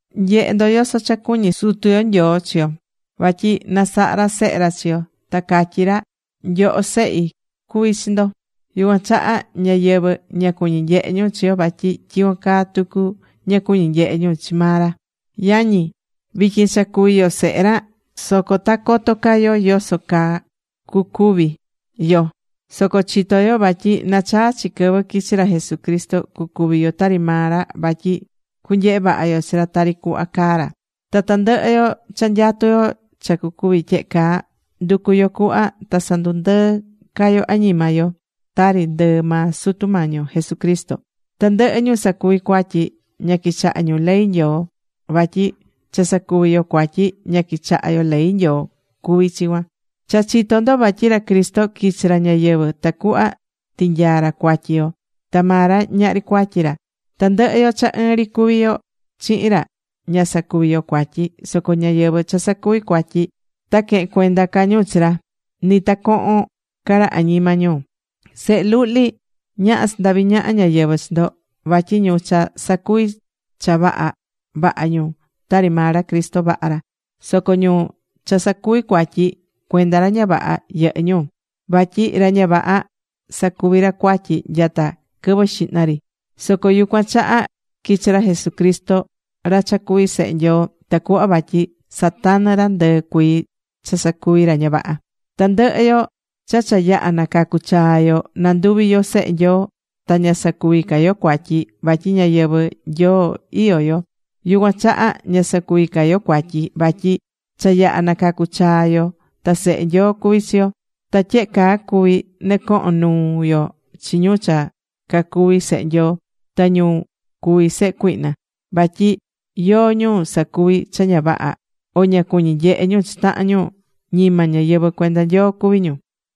Nye̱he ndo, yoso cha cuñí Sutu yo Nyoo chi yo, vatyi nasaha ra sehe ra chi yo. Ta catyí ra: “Nyoho, sehi cuví chi ndo.” Yucuan chaha ñáyɨvɨ, ña cuñí nyehe ñu chi yo vatyi tyicuan caa tucu, ña cuñí nyehe ñu chi maa ra. Yañi, vityin cha cuví yo sehe ra. Soco ta coto ca yo yoso caa cucuvi yo. Soco chitó yo vatyi nachaa chi quɨvɨ quichi ra Jesucristo, cucuvi yo tari maa ra, vatyi cunyehe vaha yo chi ra tari cuhva caá ra. Ta tandɨhɨ yo cha nyatú yo cha cucuvi tyehe caa, nducú yo cuhva ta sandundɨɨ́ ca yo añima yo, tari ndɨɨ maa Sutu Mañi yo Jesucristo. Tandɨhɨ ñu sacuví cuatyi, ña quichahá ñu ley Nyoo. Vatyi cha sacuví yo cuatyi, ña quichahá yo ley Nyoo cuví chi cuan. Cha chitó ndo vatyi ra Cristo quichi̱ ra ñayɨvɨ̱ tacuhva tinyaa̱ ra cuatyi yo, ta maa ra ñahri cuatyi ra. Tandɨhɨ yo cha ɨɨn ri cuví yo chihin ra, ña sacuví yo cuatyi. Soco ñáyɨvɨ cha sacuví cuatyi, ta quehen cuenda ca ñu chi ra, ni ta cohon ca ra añima ñu. Sehe luhli, ñaha sandavi ñaha ñáyɨvɨ chi ndo, vatyi ñu cha sacuví cha vaha, vaha ñu, tari maa ra Cristo vaha ra. Soco ñu cha sacuví cuatyi, cuenda ra ña vaha yɨhɨ́ ñu. Vatyi ra ña vaha sacuví ra cuatyi nyata quɨvɨ xihna ri. Soco yucuan chaha quichi̱ ra Jesucristo, ra cha cuví Sehe Nyoo, tacuhva vatyi satanɨ ra ndɨɨ cuii cha sacuví ra ña vaha. Tandɨhɨ yo cha cha yaha̱ nacacu̱ chaa yo, nanduvi̱ yo sehe Nyoo, ta ña sacuví ca yo cuatyi, vatyi ñayɨvɨ̱ Nyoo iyó yo. Yucuan chaha ña sacuví ca yo cuatyi, vatyi cha yaha nacacu chaa yo ta sehe Nyoo cuví chi yo. Ta tyehe caa cuví nɨcohon nuu yo chi ñu cha cacuví sehe Nyoo, ta ñu cuví sehe cuihna. Vatyi yóó ñu sacuví cha ña vaha o ña cuñí nyehe ñu chi tahan ñu, ñima ñáyɨvɨ cuenda Nyoo cuví ñu.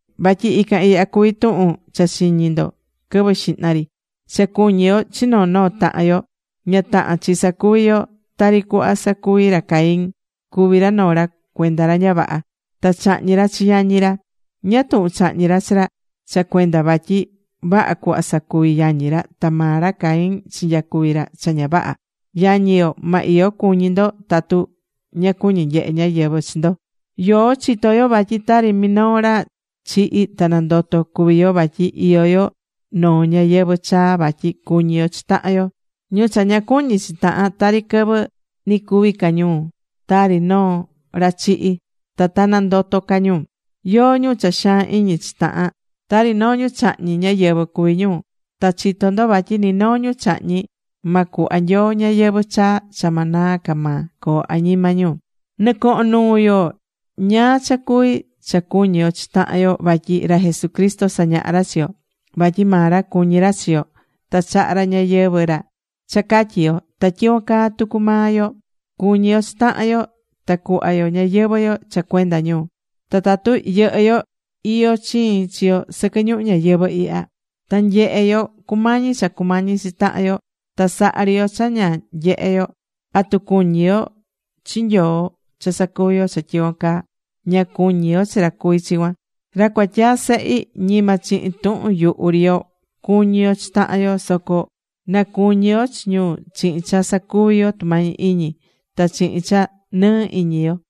Vatyi ican ihya cuví tuhun cha chiñi̱ ndo quɨvɨ xihna ri: Cha cuñi yo chi noo noo tahan yo. Ña tahán chi sacuvi yo tari cuhva sacuvi̱ ra Caín. Cuvi̱ ra noo ra cuenda ra ña vaha. Ta chahñi̱ ra chi yañi ra. ¿Ñáá tuhun chahñi̱ ra chi ra? Cha cuenda vatyi vaha cuhva sacuvi̱ yañi ra, ta maa ra Caín chinyacuvi̱ ra cha ña vaha. Yañi yo, ma iyo cuñi ndo tatu ña cuñí nyehe ñáyɨvɨ chi ndo. Yoó chitó yo vatyi tari minoo ra chihi̱ ta nandoto̱ cuví yo vatyi iyó yo noo ñayɨvɨ̱ chaa vatyi cuñí yo chi tahan yo. Ñu cha ña cuñí chi tahan, tari quɨvɨ ni cuví ca ñu tari noo ra chihi̱, ta ta nandoto ca ñu. Yóó ñu cha xaan iñi chi tahan, tari noo ñu chahñí ñáyɨvɨ cuví ñu. Ta chitó ndo vatyi ni noo ñu chahñí, ma cuhva Nyoo ñayɨvɨ̱ chaa cha ma naa ca maa coo añima ñu. Nɨcohón nuu yo ñáá cha cuví cha cuñí yo chi tahan yo vatyi ra Jesucristo sañaha̱ ra chi yo. Vatyi maa ra cuñí ra chi yo, ta chaha̱ ra ñayɨvɨ̱ ra cha catyi yo. Ta tyicuan caa tucu maa yo, cu̱ñi yo chi tahan yo ta cu̱hva yo ñayɨvɨ̱ yo cha cuenda ñu. Ta tatu yɨhɨ́ yo iyó chiin chi yo sɨquɨ ñuhu ñayɨvɨ̱ ihya, ta nyehé yo cumañí cha cumañí chi tahan yo, ta sahá ri yo cha ña nyehé yo, ¿atu cuñí yo chi Nyoo cha sacuví yo cha tyicuan caa? Ña cuñí yo chi ra cuví chi cuan. Ra cuatyaa sehi, ñima chihin tuhun yuhu ri yo, cu̱ñi yo chi tahan yo, soco na cuñi yo chi ñu chihin cha sacuví yo tumañi iñi, ta chihin cha nɨɨ iñi yo.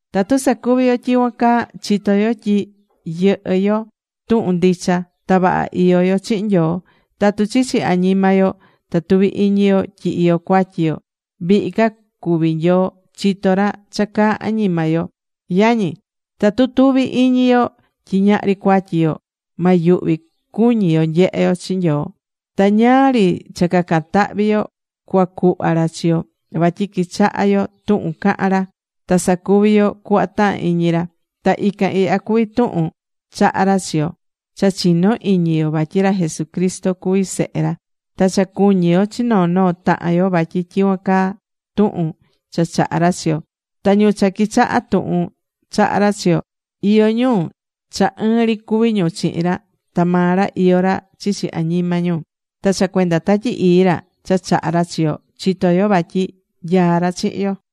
Tatu sacuví yo tyicuan caa, chitó yo tyi yɨhɨ́ yo tuhun ndicha. Ta vaha iyó yo chihin Nyoo. Tatu chichi añima yo ta tuví iñi yo tyi iyó cuatyi yo, vihi ca cuví Nyoo, chitó ra cha caá añima yo. Yañi, tatu tuví iñi yo tyi ñahri cuatyi yo, ma yuhvi cuñi yo nyehe yo chi Nyoo. Ta ñáá ri cha cacan tahvi yo cuacuhva ra chi yo, vatyi quichahá yo tuhun cahán ra, ta sacuví yo cuhva tahán iñi ra. Ta ican ihya cuví tuhun chaha̱ ra chi yo: Cha chi̱no iñi yo vatyi ra Jesucristo cuví Sehe ra. Ta cha cu̱ñi yo chi noo noo tahan yo vatyi tyicuan caa tuhun cha chaha̱ ra chi yo. Ta ñu cha quichahá tuhun chaha̱ ra chi yo, iyó ñu cha ɨɨn ri cuví ñu chihin ra, ta maa ra iyó ra chichi añima ñu. Ta cha cuenda Tatyi Ii ra cha chaha̱ ra chi yo, chitó yo vatyi nyaá ra chihin yo.